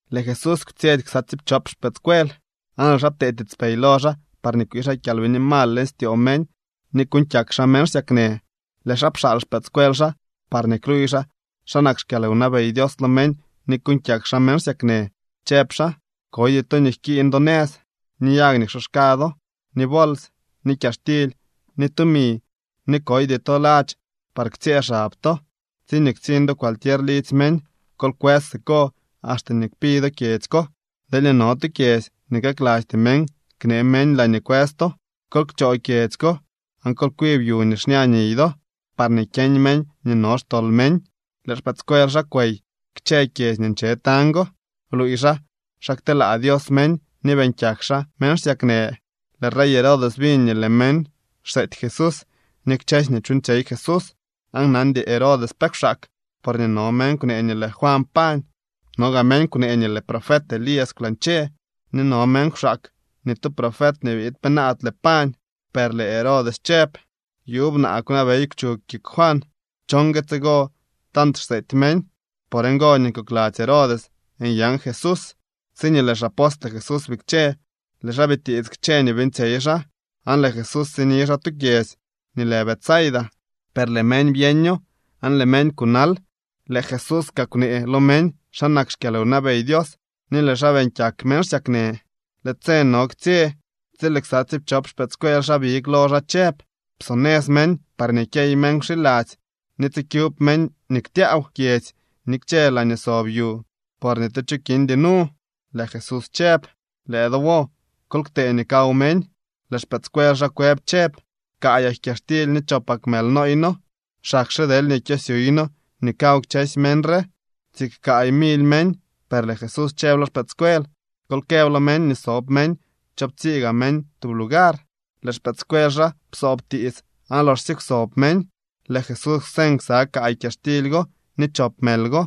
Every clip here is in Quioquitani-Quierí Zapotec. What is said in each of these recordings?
Lëë Jesús kwtsyetsy ksa tsiipchop xpëëdscuel, aan lëë xaa ptee tiitspey lo xaa parñee kwii xaa kyalbini mal leñ styoo meñ ni kuuñ kyak xaa meñ xsyaknë. Lëë xaa pxaal xpëëdscuel xaa parñee kluuy xaa xa nak xkyalwnabey Dios lo meñ ni kuuñ kyak xaa meñ xsyaknë, chëb xaa: —Koydy to nii jkiiñ do nëz, ni yag nii ksoxka do, ni bols, ni kyaxtily, ni tumi, ni koydy to ladx par ktsyëë xab to. Tsiñee ktsiñ do cualquier lidzy meñ, kol kwës siko axte nii kpi do kyedzy ko. Deelñee no tu kyedzy nii kaklasty meñ knee meñ laañee kwës to, kol kchoo kyedzy ko, aan kol kwib yu nii xña niy do, parñee kyeñ meñ nii no xtol meñ. Lëë xpëëdscuel xaa kwey kchë kyedzy nii nche tañ go, bluuy xaa xa kteelaa Dios meñ ni beeñ kyak xaa meñ xsyaknë. Lëë rey Herodes biñ nii lëë meñ xseety Jesús ni kchësy nii chuuñtsyey Jesús, aan nandy Herodes pe kwxaak, porñee no meñ kwnee nii lëë Juan pañ. No gaa meñ kwnee nii lëë profet Elías kwlañche, ni no meñ kwxaak nii tu profet nii biid penaadle pañ. Per lëë Herodes chëb: —Yuub naa kwnabey kwchug kik Juan. ¿Cho ngue tsigo tant xseety meñ? Por ngo nii kokladzy Herodes nyan Jesús. Tsiñee lëë xapostle Jesús bikche, lëë xaa bitiits kchë nii beeñtsyey xaa, aan lëë Jesús sini xaa tu kyedzy nii lë Betsaida. Per lëë meñ byeño, aan lëë meñ kunal. Lëë Jesús kaa kwnee lo meñ xa nak xkyalwnabey Dios ni lëë xaa beeñ kyak meñ xsyaknë. Lëë tse no ktsye tsi lëë ksa tsiipchop xpëëdscuel xaa big lo xaa chëb: —Psonëz meñ parñee kyey meñ wxiladzy ni tsikyub meñ nii ktyaaw kyedzy ni kchë laañee sob yu, por ni tu cho kindy nu. Lëë Jesús chëb: —Lëë do wo, kol ktee nii kaw meñ. Lëë xpëëdscuel xaa kwëb chëb: —Kaayak kyaxtily ni chopak mël nooy noo, xakxe deelñee kyosyuuy noo nii kaw kchësy meñ re. Siik kaay mily meñ, per lëë Jesús chëb lo xpëëdscuel: —Kol këb lo meñ nii sob meñ choowptsii gaa meñ tub lugar. Lëë xpëëdscuel xaa psoob tiits aan loxsye kwsob meñ, lëë Jesús kwseñ ksa kaay kyaxtily go ni chop mël go,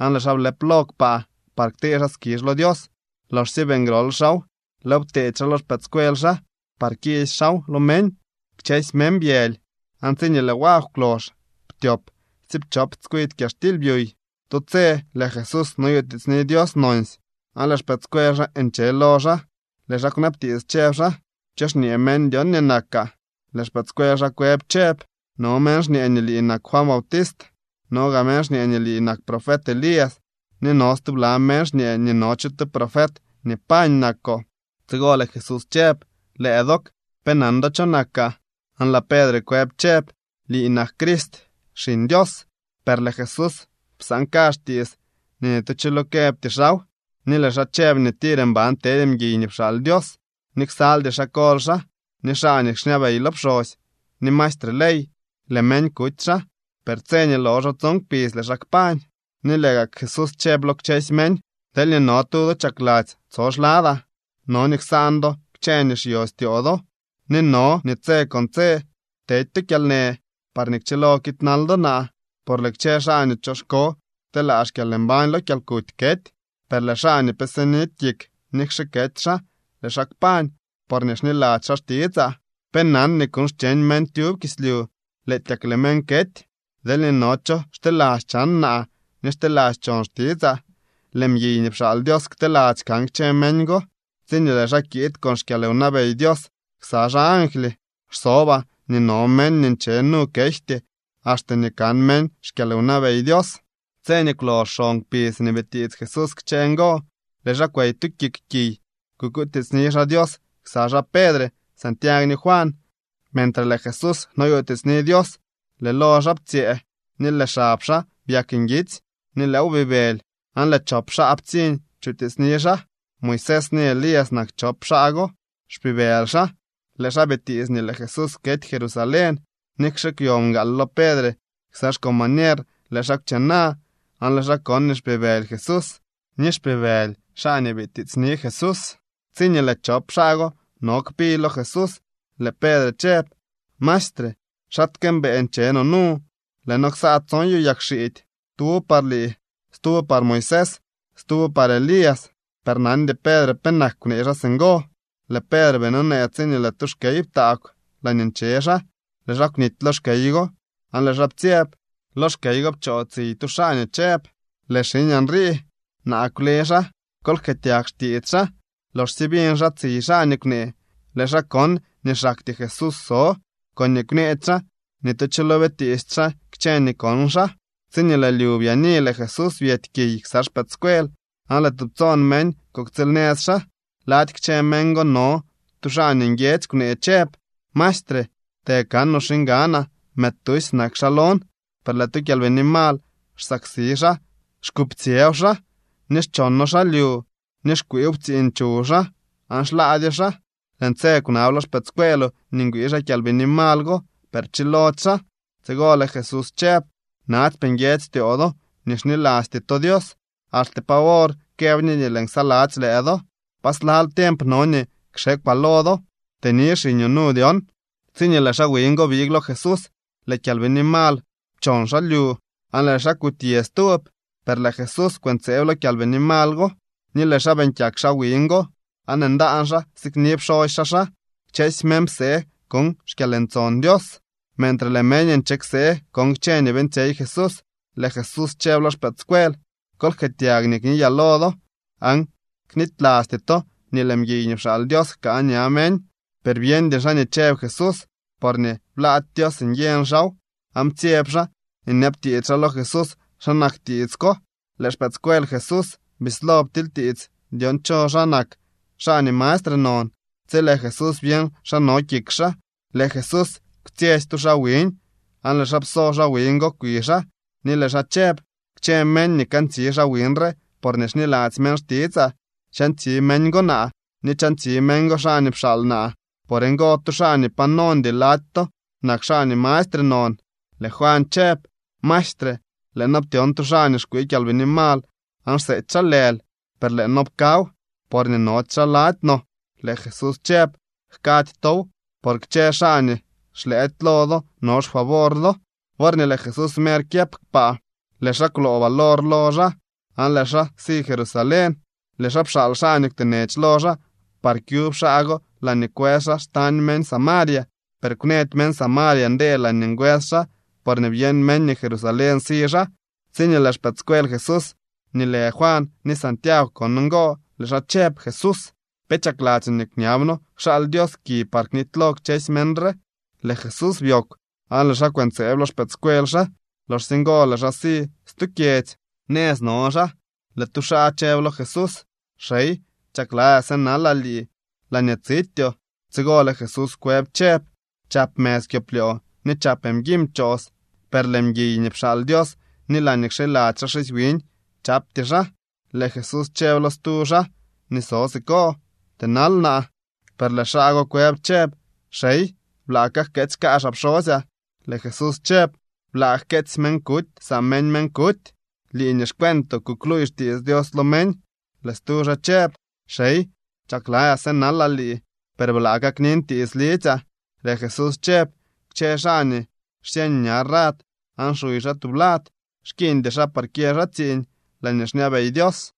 aan lëë xaa blëp lo kpaa par ktee xaa skizh lo Dios. Loxsye beeñ grol xaaw, lëëw pteedy xaa lo xpëëdscuel xaa par kiisy xaaw lo meñ. Kchësy meñ byëly, aan tsiñee lëë wagw kwlox ptyop tsiipchop tskwidy kyaxtily byuy. Tu tse lëë Jesús noyutiitsni Dios nonsy, aan lëë xpëëdscuel xaa nche lo xaa. Lëë xaa kwnabtiits, chëb xaa: —¿Cho xñee meñ dyon nii nakaa? Lëë xpëëdscuel xaa kwëb chëb: —No meñ xñee nii lii nak Juan Bautist, no gaa meñ xñee nii lii nak profet Elías, ni no stubla meñ xñee nii no cho tu profet nii pañ nakoo. Tsigo lëë Jesús chëb: —Lëë dook, ¿pe nan do cho nakaa? Aan lëë Pedre kwëb chëb: —Lii nak Crist, Xiñ Dios. Per lëë Jesús psaan kazh tiits nii ni tu cho lo këbty xaaw. Ni lëë xaa chëb nii tir mban tedy mguiy nii pxaal Dios, ni ksaldy xaa kol xaa, ni xaa nii xñabey lo pxosy, ni maestre ley. Lëë meñ kuty xaa, per tse nii loxo tson kpidz lëë xaa kpañ. Ni lëë gak Jesús chëb lo kchësy meñ: —Deelñee no tu do chakladzy tso xladaa, no nii ksaan do kchë nii xyostyoo do, ni no nii tse con tse tedy to kyalnë parñee kchilo kiidnal do naa. Por lëë kchë xaa nii choxko kteelaa xkyalmbañ lo kyalkuty kety. Per lëë xaa nii pe sinidy kik, nikxe kety xaa, lëë xaa kpañ, porñee xniladzy xaa xtitsaa. ¿Pe nan nii kuuñ xcheñ meñ tyub kislyu, lëëtyak lëë meñ kety? Deelñee no cho xteladzy chan naa ni xteladzy chon xtitsaa, lëë mguiy nii pxaal Dios kteladzy kan kchë meñ go tsiñee lëë xaa kiid con xkyalwnabey Dios ksa xaa angly. Xsobaa nii no meñ nii nche nu kejty axte nii kan meñ xkyalwnabey Dios. Tse nii kwlox xon kpidz nii bitiits Jesús kchë ngo, lëë xaa kwey tu kik kiy kukutiitsni xaa Dios ksa xaa Pedre, Santiagw ni Juan. Mentre lëë Jesús noyutiitsni Dios, lëë lo xaa ptsyëë ni lëë xab xaa byak nguitsy ni lëëw bibëly. Aan lëë chop xaa ptsiñ chutiitsni xaa. Moisés ni Elías nak chop xaa go. Xpibëly xaa. Lëë xaa bitiits nii lëë Jesús kety Jerusalén. Nikxe kwyo mgaal lo Pedre ksa xcombañer, lëë xaa kwchena, aan lëë xaa kon nii xpibëly Jesús ni xpibëly xaa nii bitiitsni Jesús. Tsiñee lëë chop xaa go no kpi lo Jesús, lëë Pedre chëb: —Maestre, ¡xaatke mbëë nche no nu! Lëë noo ksaa tson yu yagxiidy: tuwo par lii, stuwo par Moisés, stuwo par Elías. Per nandy Pedre penak kwnee xaa singo. Lëë Pedre bii nonee tsiñee lëë tu xkey ptaagw laañee nche xaa. Lëë xaa kwnity lo xkey go, aan lëë xaa ptsyeb. Lo xkey go pchoo tsiy tu xaa nii chëb: —Lëë xiñaa nrii. Naa kwle xaa. Kol jkëëtyag xtiits xaa. Loxsye biñ xaa tsiy xaa nii kwnee, lëë xaa kon nii xaktyee Jesús so. Koñee kwneedy xaa, ni tu cho lo bitiisty xaa kchë nii kon xaa. Tsiñee lëë lyu byaani, lëë Jesús byety kiy ksa xpëëdscuel aan lëë tubtsoon meñ kuktsiilnëz xaa. Lady kchë meñ go no tu xaa nii nguiedzy kwnee chëb: —Maestre, të kanoo xiñganaa. Mëëd tusy nak xaa lon. Per lëë tu kyalbini mal xsaksi xaa, xkuptsyëw xaa, ni xchono xaa lyu, ni xkwiiw ptsiiñ chuw xaa, aan xlaadyo xaa. Lëën tse kwnab lo xpëëdscueeloo nii ngwii xaa kyalbini mal go, per pchilody xaa. Tsigo lëë Jesús chëb: —¡Natsypee nguiedzy styoo do ni xnilasty to Dios! ¿Axte pa wor këb ñe nii lëën ksaladzy lëë do? ¿Pa slal tiemp no nii kxekwaa lo do? Tëni xiñoo nu dyon. Tsiñee lëë xaa wiñ go big lo Jesús, lëë kyalbini mal pchon xaa lyu, aan lëë xaa kutyë stub. Per lëë Jesús kwëntseeb lo kyalbini mal go, ni lëë xaa beeñ kyak xaa wiñ go, aan ndaan xaa sikni pxosy xaa xaa. Kchësy meñ psee kon xkyalntson Dios. Mentre lëë meñ nche ksee kon kchë nii beeñtsyey Jesús, lëë Jesús chëb lo xpëëdscuel: —Kol jkëëtyag nii kniyaa lo do, aan knitylasty to nii lëë mguiy nii pxaal Dios jkaa ña meñ. Per byeñdy xaa nii chëb Jesús, porñee blaady Dios nyeñ xaaw, aan ptsyeb xaa nyabtiits xaa lo Jesús xa nak tiits ko. Lëë xpëëdscuel Jesús bislo ptilytiits dyon cho xaa nak xaa nii mastre non. Tsi lëë Jesús byeñ xa no kik xaa, lëë Jesús kwtsyetsy tu xaa wiñ, aan lëë xaa pso xaa wiñ go kwi xaa, ni lëë xaa chëb: —Kchë meñ nii kantsi xaa wiñ re porñee xniladzy meñ xtitsaa, chantsi meñ go naa, ni chantsi meñ go xaa nii pxaal naa. Por ngo, tu xaa nii pa nondy lady to nak xaa nii mastre non. Lëë Juan chëb: —Maestre, lëë noo ptyon tu xaa nii xkwii kyalbini mal aan xseety xaa lël, per lëë noo pkaw, porñee nody xaa lady no. Lëë Jesús chëb: —Jkady tow, por kchë xaa nii xlëëdy lo do no xfavor do. Worñee lëë Jesús mer kyëp kpaa, lëë xaa kwloo valor lo xaa, aan lëë xaa si Jerusalén. Lëë xaa pxaal xaa nii kwtenech lo xaa par kyub xaa go laañee kwës xaa xtañ meñ Samaria. Per kwnëdy meñ Samaria ndee laañee ngwës xaa, porñee byeñ meñ nii Jerusalén si xaa. Tsiñee lëë xpëëdscuel Jesús nii lë Juan ni Santiagw kon ngo, lëë xaa chëb: —Jesús, ¿pe chakladzyoo nii kñab noo kxaal Dios ki par knitylo kchësy meñ re? Lëë Jesús byoogw, aan lëë xaa kwëntseeb lo xpëëdscuel xaa. Loxsye ngo lëë xaa si stu kyedzy. Nëz no xaa, lëë tu xaa chëb lo Jesús: —Xey, chakladzyaa sënalaa lii laañee tsityoo. Tsigo lëë Jesús kwëb chëb: —Chap mëz kyoplyoo ni chap mguiñ pchoos, per lëë mguiy nii pxaal Dios ni laañee kxiladzy xaa xisy wiñ chapty xaa. Lëë Jesús chëb lo stu xaa nii so siko: —Tënal naa. Per lëë xaa go kwëb chëb: —Xey, blaa kajkeetsy kaazhaa pxosyaa. Lëë Jesús chëb: —Blaa jkeetsy meñ kutysaa meñ meñ kuty. Lii nii xcueentoo kukluuy xtiits Dios lo meñ. Lëë stu xaa chëb: —Xey, chakladzyaa sënalaa lii, per blaa kaknin tiits lidzyaa. Lëë Jesús chëb: —Kchë xaa nii xsyeñ ña rad aan xuy xaa tublad, xkiiñdy xaa par kyë xaa tsiiñ laañee xñabey Dios.